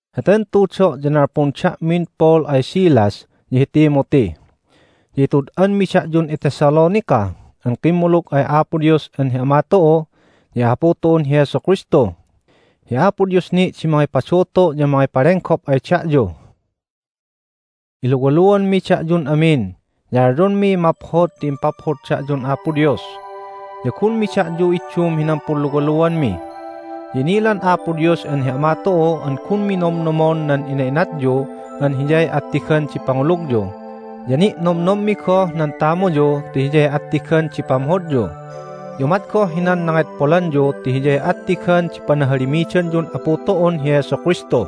Heten tudo' ya nalpun da'min Paul ay Silas, ya hi Timothy. Ya itud'anmi da'yun iThessalonica an kimmulug ay Apo Dios an hi Ama tu'u ya hi Apu tu'un hi Jesu Kristu. Hi Apo Dios ni' di mangipadutu' ya mangipalenggop ay da'yu. Iluwaluanmi da'yun amin, ya alyonmiy maphod ti impaphod da'yun Apo Dios. Ya gunmi da'yu iddum hinan punluwaluanmi. Ya inilan Apo Dios an hi Ama tu'u an gunmi nomnomon nan ina'inatyu an hiyay attigan di pangulugyu, ya ni'nomnommi goh nan tamuyu ti hiyay attigan di pamhodyu, ya umat goh hinan nangedpolanyu ti hiyay attigan di panahalimidanyun Apu tu'un hi Jesu Kristu.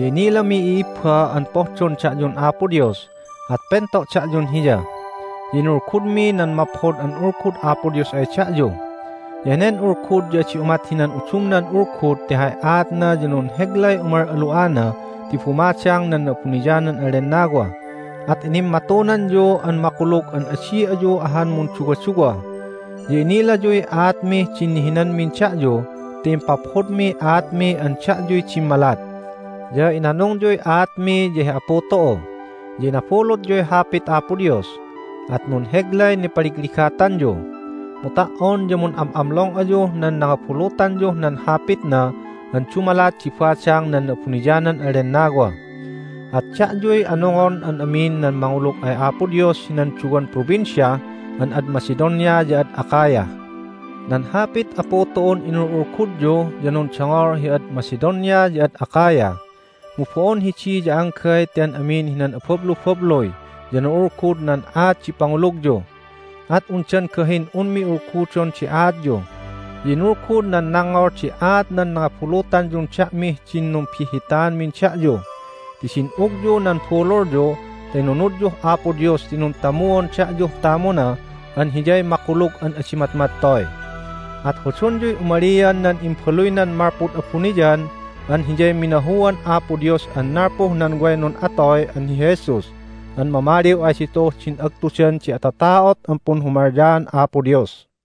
Ya inilami, i'ibba, an pohdon da'yun Apo Dios, at pento' da'yun Hiya. Ya inulgudmi nan Maphod an Ulgud Apo Dios ay da'yu. Ya henen Ulgud ya adi umat hinan udumnan ulgud ti hay aatna ya nunheglay umal'alu'ana ti bumadang nan Na'abuniyanan an Lennawa, at inimmatunanyu an makulug an adi ayu ahan munduwaduwa. Ya innilayuy aatmih din nihinanmin da'yu ti impaphodmiy aatmi an da'yuy dimmalat. Ya inanungyuy aatmi ya hi Apu tu'u. Ya inabulutyuy Hapit Apo Dios, at nunheglay nipaligligatanyu. Mu ta"on ya mun'am'amlong ayuh nan nangabulutanyuh nan Hapitna an dumalat di badang nan Na'abuniyanan an Lennawa. At da'yuy anungon an amin nan mangulug ay Apo Dios hinan duwan provincia an ad Macedonia ya ad Achaia. Nan Hapit Apu tu'un inul'ulgudyu ya nundongol hi ad Macedonia ya ad Achaia. Mu bo'on hidi ya anggay ti an amin hinan abablubabluy ya na'ulgud nan aat di pangulugyu, at undan gahin unmi ulgudon di aatyu. Ya inulgud nan nangngol di aat nan nangabulutanyun da'mih din numbihhitanmin da'yu. Ti din'ugyu nan bululyu ta inunudyuh Apo Dios ti nuntamuon da'yuh tamuna an Hiyay makulug an adi matmattoy. At hodonyuy umalian nan Imbaluynan malpud abuniyan an Hiyay minahuan Apo Dios an nalpuh nan way nun'atoy an hi Jesus an mamaliw ay ditu'uh din agtudan di atata'ot an punhumalyaan Apo Dios.